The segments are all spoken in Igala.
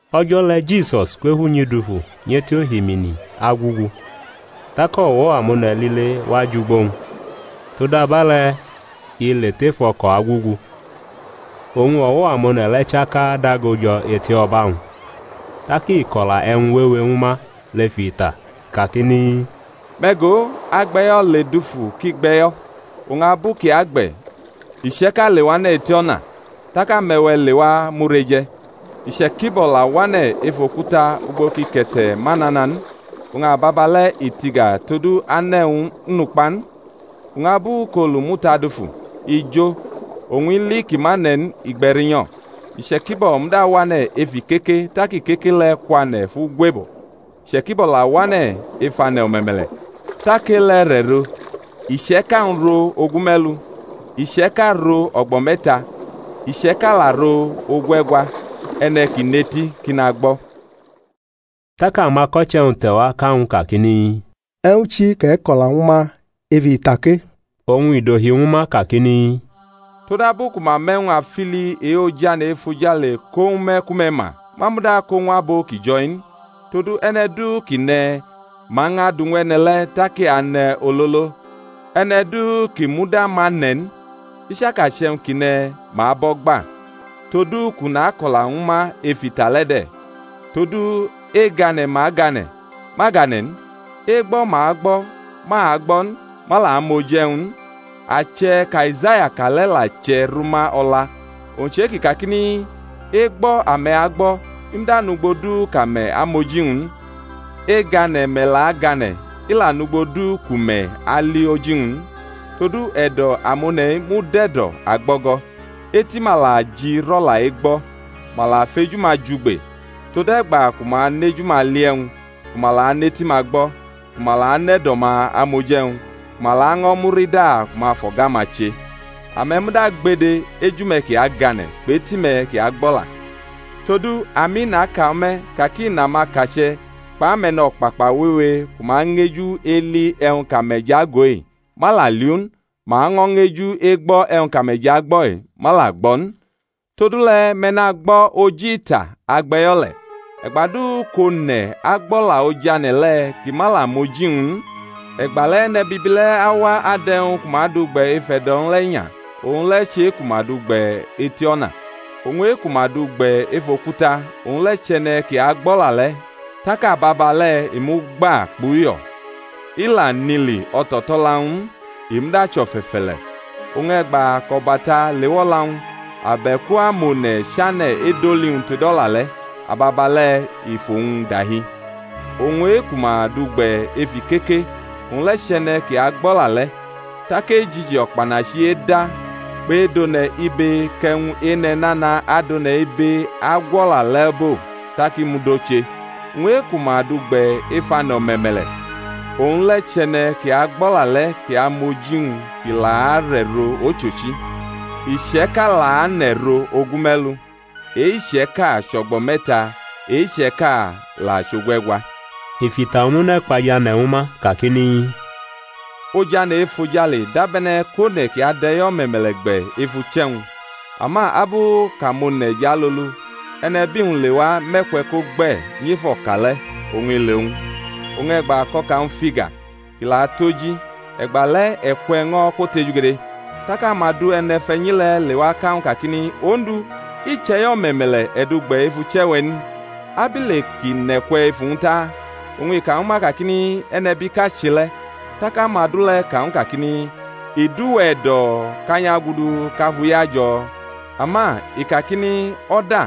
O̩jo̩ le̩ Jisus kwʼef unyi dufu nyʼeti ohimini agugu. Tak o̩wo̩ amone̩ lile wa jʼugbo-wñ, todabe̩le̩ i le tef o̩ko̩ agugu; oñ o̩wo̩ amone̩ le̩ chaka dago jo̩ eto̩ba-wñ. Tak i ko̩la e̩wñ wewe ñwu ma lef ita kakini, Me̩ go, agbe̩yo̩ le dufu kʼi gbʼe̩yo̩. Oñ abu kʼi agbe̩, iche̩ka lewane̩ eti o̩na, tak ame̩we̩ lewa mʼu reje̩. Iche̩kibo̩ la wane̩ ef okuta ugbo kʼike̩te̩ ma nana n; oñ ababale̩ i tiga todu ane̩-wñ nʼukpa n. Oñ abu kʼolu muta dufu, i jo; oñ ili kʼi ma ne̩ n, i gbe̩ rinyo̩. Iche̩kibo̩ muda wane̩ ef ikeke tak ikeke le̩ kwane̩ fʼu gwebo. Iche̩kibo̩ la wane̩ ef ane̩ o̩me̩me̩le̩. Tak e-le̩ rʼe̩ro, iche̩ka-wñ ro ogume̩lu, iche̩ka ro o̩gbo̩ me̩ta, iche̩ka la ro ogue̩gwa. E̩ne̩ ki nʼeti kʼi nagbo̩. Tak amako̩che̩-wñ te̩wa ka ñw u kakini, E̩wñ chi kʼe̩ ko̩la ñwu ma ef ita ke? Oñ i dohi ñwu ma kakini, Todabu ku ma mʼe̩wñ afili e-ojane̩ efojale ko ñwu me̩ ku me̩ ma; ma muda ko ñw abo ki jo̩-i n. Todu e̩ne̩ du kʼi ne̩, ma ñʼadu ñw e̩ne̩ le̩ tak i ane̩ ololo; e̩ne̩ du ki muda ma ne̩ n, i chaka chʼe̩wñ kʼi ne̩, ma abʼo̩ gba. Todu kʼu nako̩la ñwu ma ef ita le̩ de̩, todu egane̩ ma gane̩, ma gane̩ n; egbo̩ ma gbo̩ ma agbo̩ n; ma la mʼoji e̩wñ n. Ache̩ kʼAizaya ka le̩ la che̩ rʼuma o̩la, owñ chʼe-kʼi kakini, Egbo̩ ame̩ agbo̩, i muda nʼugbo du kʼame̩ amʼoji-wñ n; egane̩ me̩ la agane̩, i la nʼugbo du ku me̩ ali oji-wñ n. Todu e̩do̩ amone̩-i mud e̩do̩ agbo̩go̩, eti-ma la ji rʼo̩la egbo̩, ma la fʼeju-ma jugbe; tode̩gba ku ma anʼeju-ma li e̩wñ, ku ma la anʼeti-ma gbo̩, ku ma la nʼe̩do̩-ma amʼoji e̩wñ, ku ma laño̩ murida kʼu fʼo̩ga-ma che. Ame̩ muda gbede, eju-me̩ kʼi agane̩; kpʼeti-me̩ ki agbʼo̩la. Todu, ami naka ñwu me̩ ka ki nʼamakache̩ kpʼame̩no̩kpakpa wewe ku ma ñeju eli e̩wñ kʼame̩ jʼago-i, ma la liʼu n; ma ño̩ ñeju egbo̩ e̩wñ kʼame̩ jʼagbo̩-i, ma la gbo̩ n. Todule̩, me̩ nagbo̩ oji ita agbe̩yo̩ le̩. E̩gba du kʼone̩ agbʼo̩la ojane̩ le̩, kʼi ma la mʼoji-wñ n, e̩gbale̩ e̩ne̩bibi le̩ awa adʼe̩wñ ku ma du gbe̩ ef e̩do̩-wñ le̩ inya. Owñ le̩ chʼe-ku ma du gbe̩ eti o̩na. Oñ e-ku ma du gbe̩ ef okuta, owñ le̩ chʼe̩ne̩ kʼi agbʼo̩la le̩, tak ababale̩ i mʼugba kpʼuyo̩. I la nʼili o̩to̩to̩la-wñ n, i muda chʼo̩fe̩fe̩le̩; oñ e̩gba kʼo̩bata lewʼo̩la-wñ, abe̩ku amone̩ chane̩ edoli-wñ tod o̩la le̩, ababale̩ i fʼowñ dahi. Oñ e-ku ma du gbe̩ ef ikeke, owñ le̩ chʼe̩ne̩ kʼi agbʼo̩la le̩ tak ejiji o̩kpanachi-i eda kpʼedʼone̩ ibe kʼe̩wñ ene̩ nana adʼone̩ ibe agwʼo̩la le̩ bo, tak i mud oche. Oñ e-ku ma du gbe̩ ef ane̩ o̩me̩me̩le̩, owñ le̩ chʼe̩ne̩ kʼi agbʼo̩la le̩ kʼi amʼoji-wñ kʼi la arʼe̩ro ochochi: iche̩ka la anʼe̩ro ogume̩lu, e-iche̩ka chʼo̩gbo̩ me̩ta, e-iche̩ka la chʼogue̩gwa. I fʼita omune̩ kpa jʼane̩ ñwu ma kakini, Ojane̩ efojale dabe̩ne̩ kʼone̩ kʼi adʼe̩yo̩ o̩me̩me̩le̩ gbe̩ ef uche̩-wñ; ama abu kʼamone̩ jʼalolu, e̩nebi-wñ lewa mʼe̩kwe̩ ko gbe̩ nyʼef o̩ka le̩, oñ i le owñ. Oñ e̩gba kʼo̩ka-wñ fʼiga, kʼi la tʼoji, e̩gba le̩ e̩kwe̩ ño̩ kwotejugede. Tak amadu e̩ne̩fe̩nyi le̩ lewa ka ñw u kakini, Odu, i chʼe̩yo̩ o̩me̩me̩le̩ e̩ du gbe̩ ef uche̩-we̩ n? Abile kʼi nʼe̩kwe̩ ef uwñ ta? Oñ i ka ñwu ma kakini, E̩nebiʼka che le̩. Tak amadu le̩ ka ñw u kakini, I dʼuwe̩ e̩do̩ kʼa nyʼagudu, kʼa fʼu yajo̩? Ama i kakini, O̩da,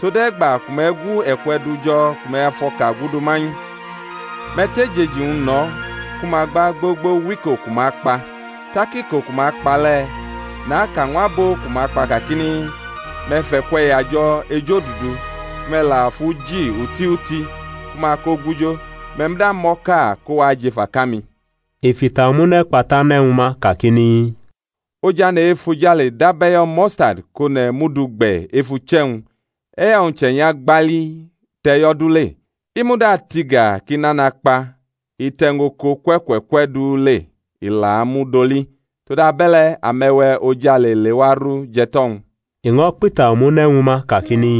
tode̩gba ku me̩ gu e̩kwe̩ du jo̩ ku me̩ fʼo̩ka gudu manyʼu. Me̩ tʼejeji-wñ no̩ ku ma gba gbogbo wʼiko ku ma kpa; tak iko ku ma kpa le̩, naka ñw abo ku ma kpa kakini, Me̩ fʼe̩kwe̩ yajo̩ ejodudu, ku me̩ la fʼu ji oti oti, ku ma ko gujo; me̩ muda mʼo̩ka ko wa jʼef aka-mi. I fʼita omune̩ kpa tʼane̩ ñwu ma kakini, Ojane̩ efojale dab e̩yo̩ mustadi kʼone̩ mʼu du gbe̩ ef uche̩-wñ. E̩yo̩-wñ chenya falii tʼe̩yo̩ du le; i muda tiga kʼi nana kpa, i tʼe̩wñ oko kwe̩ kwe̩ kwe̩ du le, i la mud oli. Todabe̩le̩ ame̩we̩ ojale lewa ru jʼe̩to̩-wñ. I ño̩ kpʼita omune̩ ñwu ma kakini,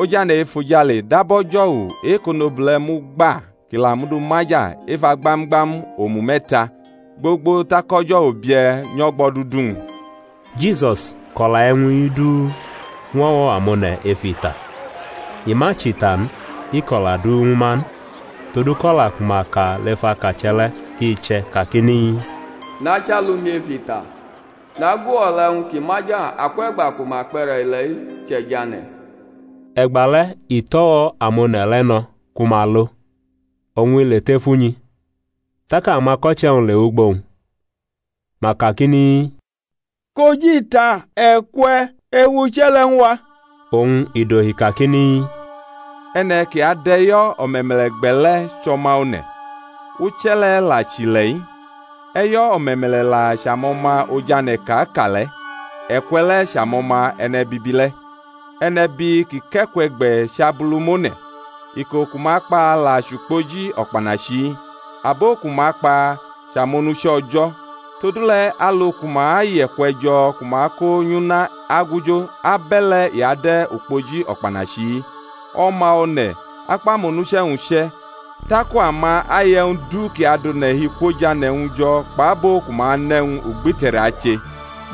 Ojane̩ efojale dab o̩jo̩wu e-kʼonobule̩ mʼu gba kʼi la du maja ef agbam-gbam omu me̩ta, gbogbo tak o̩jo̩wu bie̩ nyʼo̩gbo̩dudu-wñ. Jisus ko̩la e̩wñ-i du ñw o̩wo̩ amone̩ ef ita; i ma chʼita n i ko̩la du ñwu ma n. Todu kʼo̩la ku ma ka lef akache̩ le̩ kʼi che̩ kakini, Nachʼalu-mi ef ita, nagu o̩la e̩wñ ki maja akwʼe̩gba ku ma kpʼe̩re̩ ile̩-i che̩ jʼane̩. E̩gba le̩ i tʼo̩wo̩ amone̩ le̩ no̩ ku ma lo, oñ i le tef unyi. Tak amako̩che̩-wñ lewʼugbo-wñ, ma kakini, kʼoji ita e̩kwe̩ ef uche̩ le̩ ñw a. Oñ i dohi kakini, E̩ne̩ kʼi adʼe̩yo̩ o̩me̩me̩le̩ gbe̩ le̩ chʼO̩ma One̩. Uche̩ le̩ la chʼile̩-i; e̩yo̩ o̩me̩me̩le̩ la chʼamo̩ma Ojane̩ kʼa ka le̩; e̩kwe̩ le̩ chʼamo̩ma e̩ne̩bibi le̩. E̩nebi kʼi kʼe̩kwe̩ gbe̩ chʼAbulumone̩; iko ku ma kpa la chʼukpoji o̩kpanachi-i; abo ku ma kpa chʼamonuche̩ O̩jo̩. Todule̩ alu ku ma yʼe̩kwe̩ jo̩ ku ma kʼo nyʼuna agujo, abe̩le̩ i ade̩ ukpoji o̩kpanachi-i. O̩ma One̩ akpʼamonuche̩-wñ uche̩, taku ama ayʼe̩wñ du kʼi adʼone̩ hi kwʼojane̩-wñ jo̩ kpʼabo ku ma nʼe̩wñ ugbite̩re̩ ache;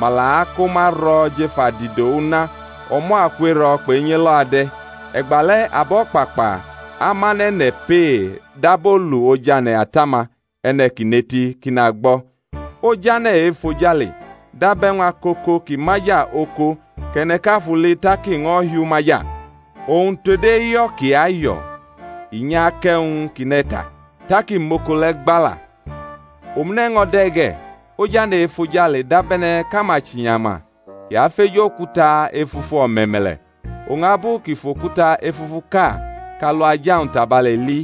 ma la ako ma ro̩ jef adido una: o̩mo̩ aku ero̩ kpʼenyi elo̩ ade̩. E̩gbale̩ abo̩kpakpa amʼane̩ ne̩ pee dab olu ojane̩ Ata-ma. E̩ne̩ kʼi nʼeti kʼi nagbo̩. Ojane̩ efojale dab e̩wñ akoko kʼi maja oko kʼe̩ne̩ʼka fʼu li tak i ño̩ hiʼu maja; oñ tod eyo̩ kʼi ayo̩ i nyʼakʼe̩wñ kʼi ne̩ ta, tak i mʼoko le̩ gba la. Omune̩ ño̩ de̩ ge̩, Ojane̩ efojale dabe̩ne̩ kʼachinyama kʼi afeju okuta efufu o̩me̩me̩le̩; oñ abu kʼi fʼokuta efufuʼka kʼalu aja-wñ tabale li,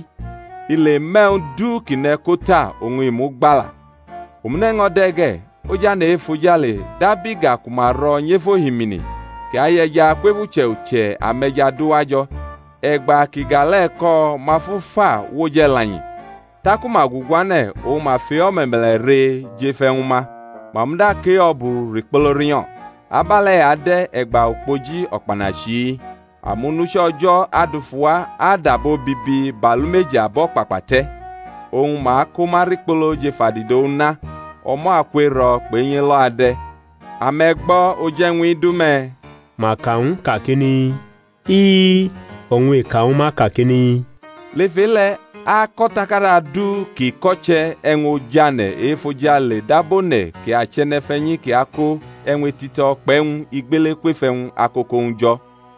i le mʼe̩wñ du kʼi ne̩ ko ta, oñ i mʼu gba la. Omune̩ ño̩ de̩ ge̩, Ojane̩ efojale dab iga ku ma ro̩ nyʼef ohimini kʼi ayʼe̩ja kwef uche̩ uche̩ ame̩ja du wajo̩. E̩gba kʼiga le̩ ko̩ ma fʼu fa wʼoj e̩lanyi. Taku ma guguane̩ oñ ma fʼe-o̩me̩me̩le̩ re jʼef e̩wñ-ma. Ma muda kʼe-o̩bu rikpolo rinyo̩. Abe̩le̩ i ade̩ e̩gba ukpoji o̩kpanachi-i; amonuche̩ O̩jo̩ adufu wa adʼabo bibi bʼalumeji abo̩kpakpa te̩, oñ ma ako ma rikpolo jʼef adido una. O̩mo̩ aku ero̩ kpʼenyi elo̩ ade̩. Ame̩ gbo̩ oji e̩wñ-i du me̩? Ma ka ñw u kakini, I-i. Oñ i ka ñwu ma kakini, Lef e-le̩ ako̩takada du kʼi ko̩che̩ e̩wñ ojane̩ efojale dab one̩ kʼi chʼe̩ne̩fe̩nyi kʼi ako e̩wñ etito̩ kpʼe̩wñ igbele kwef e̩wñ akoko-wñ jo̩.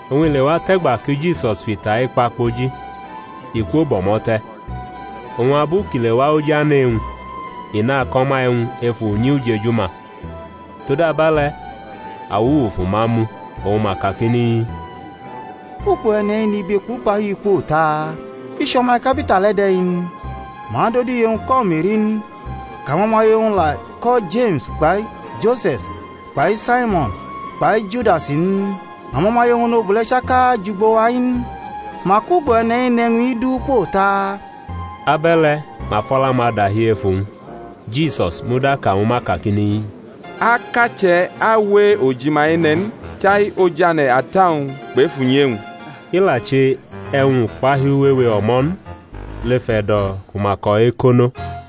Oñ i lewa tʼe̩gba ki Jisus fʼita-i kpa kpoji, i kwo bʼo̩mo̩ te̩. Oñ abu kʼi lewa oj ane̩ e-wñ, i nako̩ ma e̩wñ ef unyi ujeju-ma, todabe̩le̩, awuwu fʼuma mu, oñ ma kakini, Ugbo E̩ne̩-i nʼibe kpʼukpahiu-i kwo ta? I chʼo̩ma ikapita le̩ de̩ n? Ma dʼodu iye-wñ ko̩ Me̩ri n? kʼamo̩maye-wñ la ko̩ Jeme̩s kpai Jose̩s kpai Saimo̩n kpai Judas in? Amo̩maye-wñ onobule̩ chaka jʼugbo-wa-i n? Mak ugbo e̩ne̩-i nʼe̩wñ-i du kwo ta? Abe̩le̩ ma fʼo̩la-ma dahi ef uwñ. Jisus muda ka ñwu ma kakini, Akache̩ awe ojima ene̩ n, chai oj ane̩ ata-wñ kpʼef unyi e-wñ. I la che e̩wñ ukpahiu wewe o̩mo̩ n lef e̩do̩ ku ma ko̩ ekono.